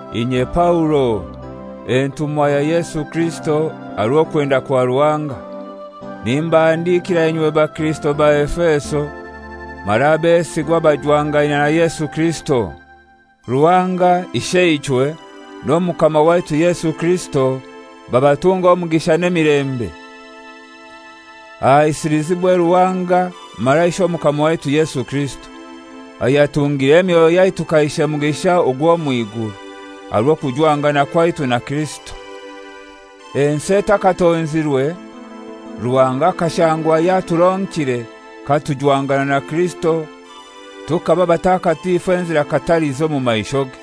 Inye Paulo, entumwa ya Yesu Kirisito aha rw'okwenda kwa Ruhanga: Nimbahandikira inywe bakirisito ba Efeso mara abesigwa abajwangaine na Yesu Kirisito. Ruhanga Isheichwe n'Omukama waitu Yesu Kirisito babatunge omugisha n'emilembe. Ahaisilizibwe Ruhanga mara Ishe Omukama waitu Yesu Kirisito, ayatungire emyoyo yaitu kaishe mugisha ogw'omw'iguru, aha rw'okujwangana kwaitu na Kirisito. Ensi etakatonzirwe, Ruhanga akashangwa yaturonkire katujwangana na Kirisito tukaba batakatifu enzira katalizi omu maishoge.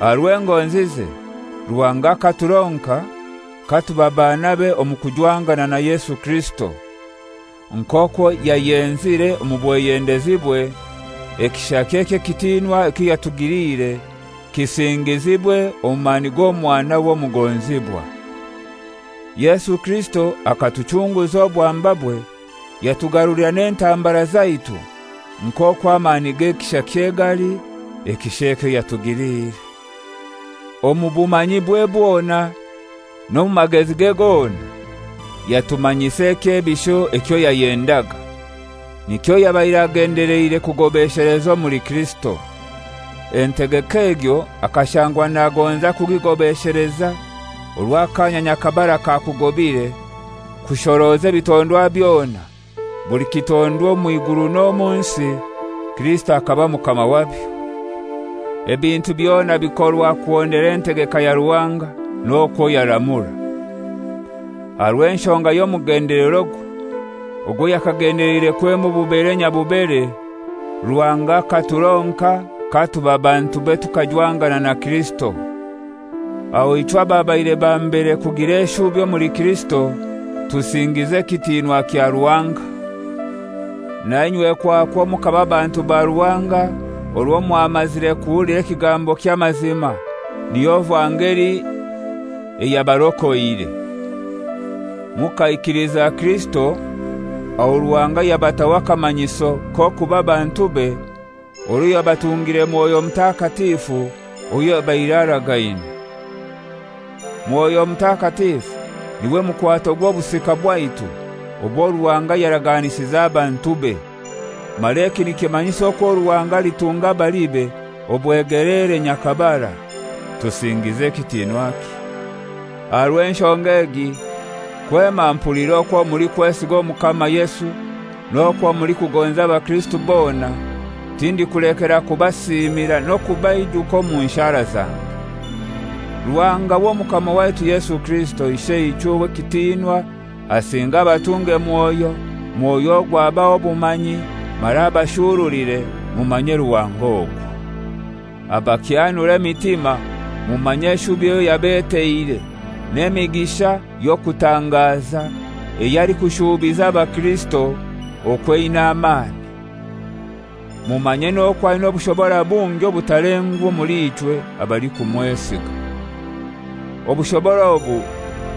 Aha rw'engonzize, Ruhanga akaturonka katuba banabe omu kujwangana na Yesu Kirisito, nk'okwo yayenzire omu bweyendezibwe, ekishakye eky'ekitinwa ekyo yatugiliire kisingizibwe omu mani g'Omwanawe omugonzibwa. Yesu Kirisito akatuchunguza obwambabwe, yatugarulira n'entambara zaitu nk'okwo amani g'ekishakye gali, ekisha ekyo yatugiliire. Omu bumanyibwe bwona n'omu magezige gona, yatumanyisa ekyebisho ekyo yayendaga, nikyo yabaire agendeleire kugobesheleza omuli Kirisito. Entegeka egyo akashangwa nagonza kugigobesheleza orwo akaanya nyakabara kakugobire kushoroza ebitondwa byona, buli kitondwa omw'iguru n'omu nsi, Kirisito akaba Mukama wabyo. Ebintu byona bikorwa kuhondera entegeka ya Ruhanga n'okwo yaramura. Aha rw'enshonga y'omugendelerogwe, ogwo yakagendeleire kwema obubere nyabubere, Ruhanga akaturonka katuba bantube tukajwangana na Kirisito. Aho ichwe ababaire ba mbere kugira eshubi omuli Kirisito, tusingize ekitinwa kya Ruhanga. Nainywe kwakwo mukaba bantu ba Ruhanga orwo mwamazire kuhulira ekigambo ky'amazima, niyo vangeli eyabarokoire. Mukaikiliza Kirisito, aho Ruhanga yabataho akamanyiso k'okuba bantube orwo yabatungire Mwoyo Mutakatifu owo yabaire aragaine. Mwoyo Mutakatifu n'iwe mukwato gw'obusika bwaitu obwo Ruhanga yaraganisize abantube, mara eki nikimanyisa okwo Ruhanga alitunga abalibe obwegeleere nyakabara. Tusingize ekitinwakye. Aha rw'enshonga egi, kwema mpuliire okwo mulikwesiga Omukama Yesu n'okwo mulikugonza abakirisito bona, tindikulekera kubasiimira n'okubaijuka omu nshara zange, Ruhanga w'Omukama waitu Yesu Kirisito, Isheichwe ow'ekitinwa asinge abatunge Mwoyo, Mwoyo ogwo abahe obumanyi mara abashurulire mumanye Ruhanga ogwo. Abakyanure emitima mumanye eshubi eyo yabeteire, n'emigisha y'okutangaza eyo alikushuubiza abakirisito okwo eina amani. Mumanye n'okwo aina obushobora bungi obutalengwa omuli ichwe abalikumwesiga. Obushobora obu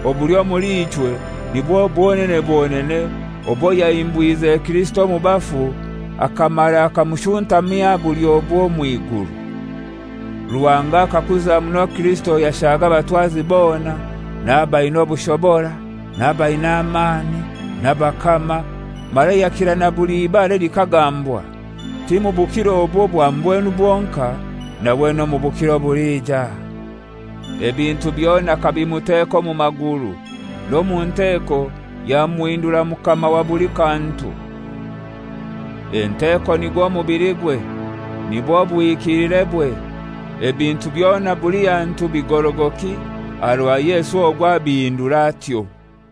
obuli omuli ichwe nibwo bwonene bwonene obwo yahimbwize Kirisito omu bafu akamara akamushuntamya aha bulyobwe omw'iguru. Ruhanga akakuza muno Kirisito yashaga abatwazi bona n'abaina obushobora n'abaina amani, n'abakama, mara yakira na buli ibara elikagambwa, ti mu bukiro obu obwa mbwenu bwonkai nawe n'omu bukiro obulija. Ebintu byona akabimuteka omu maguru, n'omu nteeko yamuhindura Mukama wa buli kantu. Enteko nigwo mubiligwe, nibwo buhikilirebwe, ebintu byona buli hantu bigorogoki aha rwa Yesu ogwo abindura atyo.